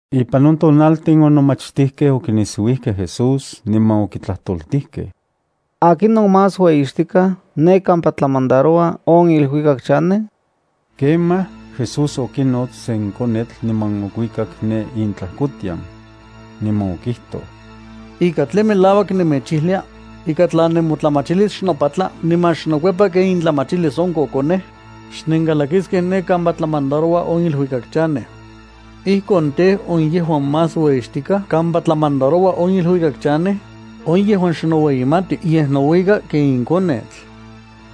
Ipan on tonaltin on nomachtijkej okinisiuijkej Jesús niman okitlajtoltijkej: —¿Akinon más ueyixtikaj ne kampa tlamandaroua on iluikak chanej? Ijkuakon, Jesús okinots sen konetl, niman okuikak ne intlajkotian. Niman okijtoj: —Ika tlen melauak nemechijlia, ika tla nemotlamachilis xnopatla niman xnokuepa ken intlamachilis on kokonej, xnenkalakiskej ne kampa tlamandaroua on iluikak chanej. Ijkon tej, on yejuan más ueyixtikaj kampa tlamandaroua on iluikak chanej, on yejuan xnoueyimati yej nouika ken in konetl.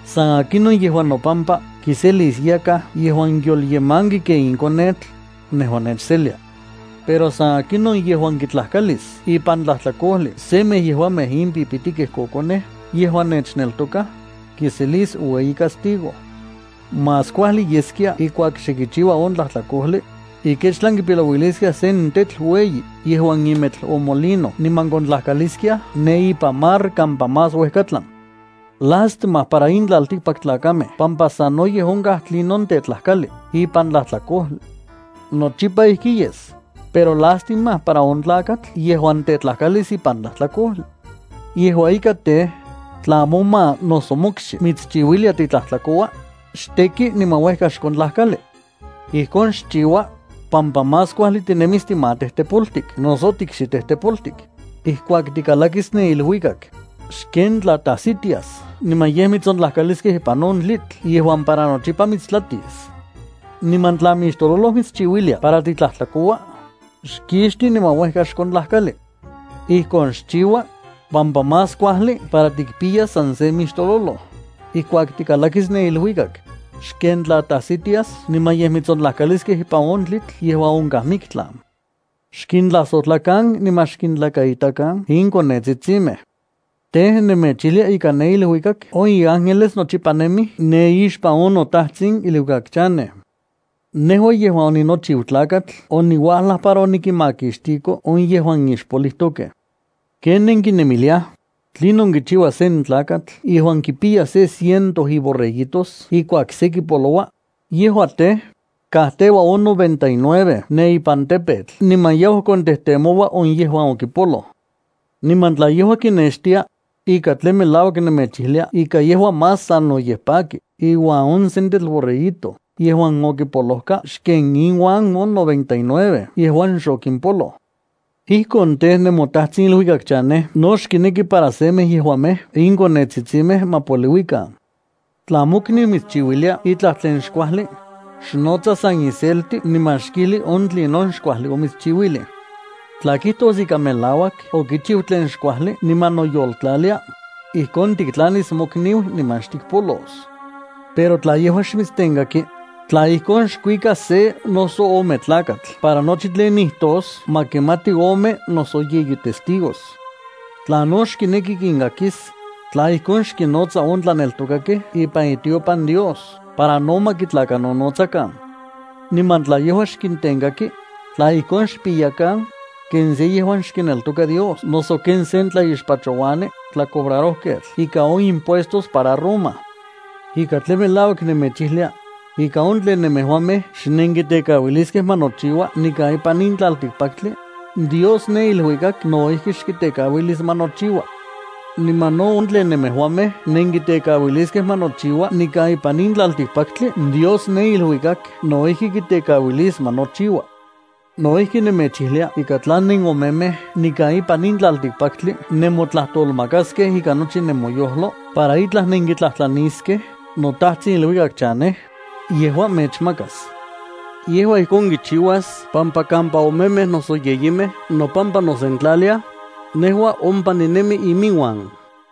San akinon yejuan nopampa kiselis yakaj yejuan yolyemanki ken in konetl, nejua nechselia. ’Pero san akinon yejuan kitlajkalis ipan tlajtlakojli semej yejuamej in pipitikej kokonej yejuan nechneltokaj, kiselis ueyi castigo. Más kuajli yeskia ijkuak xe kichiua on tlajtlakojli, ikechtlan kipilouiliskiaj sen tetl ueyi yejuan imetl on molino niman kontlajkaliskiaj ne ipan mar kampa más uejkatlan. Lástima para in tlaltikpaktlakamej pampa sanoyej onkaj tlinon tetlakalij ipan tlajtlakojli. Nochipa ijki yes, pero lastima para on tlakatl yejuan tetlakalis ipan tlajtlakojli. ’Yejua ika tej, tla moma noso mokxi mitschiuilia titlajtlakoua, xteki niman uejka xkontlajkali. Ijkon xchiua, pampa más kuajli tinemis timatejtepoltik noso tiikxitejtepoltik, ijkuak tikalakis ne iluikak, xken tla tajsitias niman yej mitsontlajkaliskej ipan on tlitl yejuan para nochipa mitstlatis. Niman tla mixtololoj mitschiuilia para titlajtlakoua, xkixti niman uejka xkontlajkali. Ijkon xchiua, pampa más kuajli para tikpiyas san se mixtololoj, ijkuak tikalakis ne iluikak, xken tla tajsitias niman yej mitsontlajkaliskej ipan on tlitl yejuan onkaj miktlan. ’Xkintlajsojtlakan niman xkintlakaitakan in konetsitsimej. Tej, nemechijlia ika ne iluikak on inángeles nochipa nemij ne ixpan on noTajtsin iluikak chanej. Nejua yejuan oninochiu Tlakatl oniuajlaj para onikinmakixtiko on yejuan ixpolijtokej. ’¿Ken nenkinemiliaj? ¿Tlinon kichiua sen tlakatl yejuan kipiya se ciento iborreguitos ijkuak se kipoloua? Yejua tej, kajteua on noventa y nueve ne ipan tepetl niman yau kontejtemoua on yejuan okipoloj. Niman tla yejua kinextia, ika tlen melauak nemechijlia ika yejua más sanoyej paki iuan on sentetl borreguito yejuan okipolojka xken inuan on noventa y nueve yejuan xokimpoloj. Ijkon tej, nemoTajtsin iluikak chanej no xkineki para semej yejuamej in konetsitsimej ma poliuikan. ’Tla mokniu mitschiuilia itlaj tlen xkuajli, xnotsa san iselti niman xkijli on tlinon xkuajli omitschiuilij. Tla kijtos ika melauak okichiu tlen xkuajli niman noyoltlalia, ijkon tiktlanis mokniu niman xtikpolos. Pero tla yejua xmitstenkaki, tla ijkon, xkuika se noso ome tlakatl para nochi tlen nijtos ma kimati ome noso yeyi testigos. Tla no xkineki kinkakis, tla ijkon, xkinnotsa on tlaneltokakej ipan itiopan Dios para no ma kitlakanonotsakan. Niman tla yejua xkintenkaki, tla ijkon xpiyakan, ken se yejuan xkineltoka Dios noso ken sen tlaixpachouani tlacobrarojketl ikan on impuestos para Roma. ’Ika tlen melauak nemechijlia, ika on tlen nemejuamej xnenkitekauiliskej ma nochiua nikan ipan in tlaltikpaktli, Dios ne iluikak no ijki xkitekauilis ma nochiua. Niman no on tlen nemejuamej nenkitekauiliskej ma nochiua nikan ipan in tlaltikpaktli Dios ne iluikak no ijki kitekauilis ma nochiua. ’No ijki nemechijlia ika tla nenomemej nikan ipan in tlaltikpaktli nemotlajtolmakaskej ikan nochi nemoyojlo para itlaj nenkitlajtlaniskej noTajtsin iluikak chanej, yejua mechmakas. Yejua ijkon kichiuas pampa kampa omemej noso yeyimej nopampa nosentlaliaj, nejua ompa ninemi iminuan.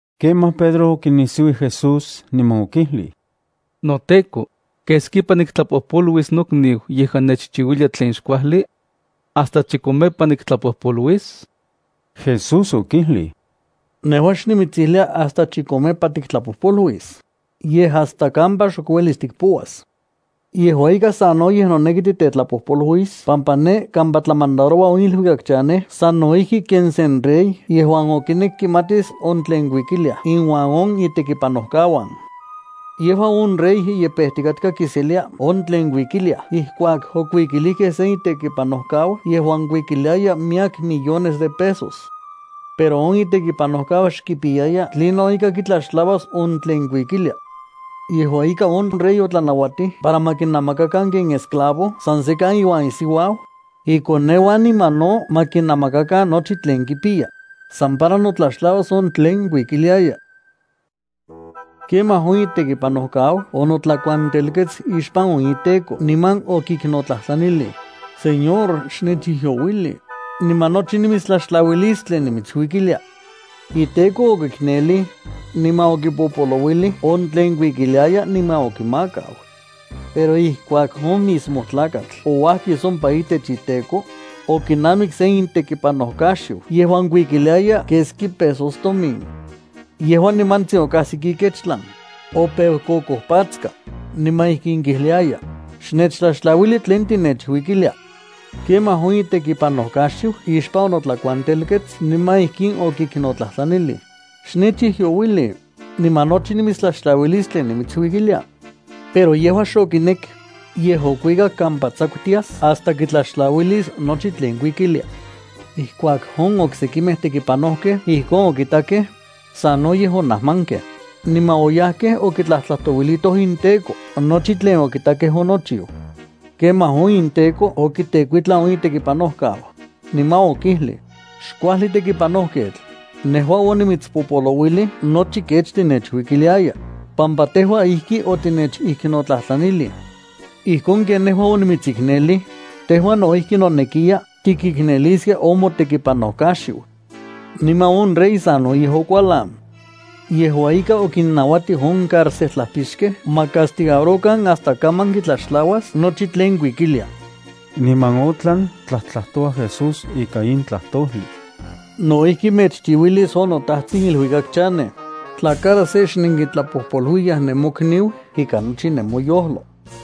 Kemaj Pedro okinisiuij Jesús niman okijlij: —NoTEKO, ¿keskipa niktlapojpoluis nokniu yejuan nechchiuilia tlen xkuajli? ¿Hasta chikomepa niktlapojpoluis? Jesús okijlij: —Nejua xnimitsijlia hasta chikomepa tiktlapojpoluis, yej hasta kampa xok uelis tikpouas. ’Yejua ika sanoyej noneki titetlapojpoluis pampa ne kampa tlamandaroua on iluikak chanej sano ijki ken sen rey yejuan okinek kimatis on tlen kuikiliaj inuan on itekipanojkauan. Yejua on rey ye pejtikatka kiselia on tlen kuikiliaj ijkuak okuikilijkej sen itekipanojkau yejuan kuikiliaya miyek millones de pesos. Pero on itekipanojkau xkipiyaya tlinon ika kitlaxtlauas on tlen kuikilia. Yejua ika on rey otlanauatij para ma kinamakakan ken esclavo san sekan iuan isiuau, ikoneuan niman no ma kinamakakan nochi tlen kipiya, san para notlaxtlauas on tlen kuikiliaya. Kemaj on itekipanojkau onotlakuantelkets ixpan on iteko niman okiknotlajtlanilij: “Señor, xnechijyouili, niman nochi nimitstlaxtlauilis tlen nimitsuikilia.” Iteko okiknelij, niman okipopolouilij on tlen kuikiliaya niman okimakau. ’Pero ijkuak on mismo tlakatl ouajkis ompa itech iteko, okinamik sen itekipanojkaxiu yejuan kuikiliaya keski pesos tomin. Yejua nimantsin okajsik ikechtlan, opeu kokojpatska, niman ijkin kijliaya: “¡Xnechtlaxtlauili tlen tinechuikilia!” Kemaj on itekipanojkaxiu ixpan onotlakuantelkets niman ijkin okiknotlajtlanilij: “Xnechijyouili, niman nochi nimitstlaxtlauilis tlen nimitsuikilia.” Pero yejua xokinek, yej okuikak kampa tsakutias hasta kitlaxtlauilis nochi tlen kuikilia. Ijkuak on oksekimej tekipanojkej ijkon okitakej, sanoyej onajmankej, niman oyajkej okitlajtlajtouilitoj inteko nochi tlen okitakej onochiu. Kemaj on inteko okitekuitlan on itekipanojkau, niman okijlij: “¡Xkuajli tekipanojketl! Nejua onimitspopolouilij nochi kech tinechuikiliaya, pampa tejua ijki otinechiknotlajtlanilij. Ijkon ken nejua onimitsiknelij, tejua no ijki nonekiya tikikneliskia on motekipanojkaxiu.” Niman on rey sanoyej okualan. Yejua ika, okinnauatij on cárcejtlajpixkej ma castigarokan hasta kaman kitlaxtlauas nochi tlen kuikilia. Niman otlan tlajtlajtoua Jesús ika in tlajtojli: —No ijki mechchiuilis on noTajtsin iluikak chanej, tla cada se xnenkitlapojpoluiyaj nenmokniu ikan nochi nemoyojlo.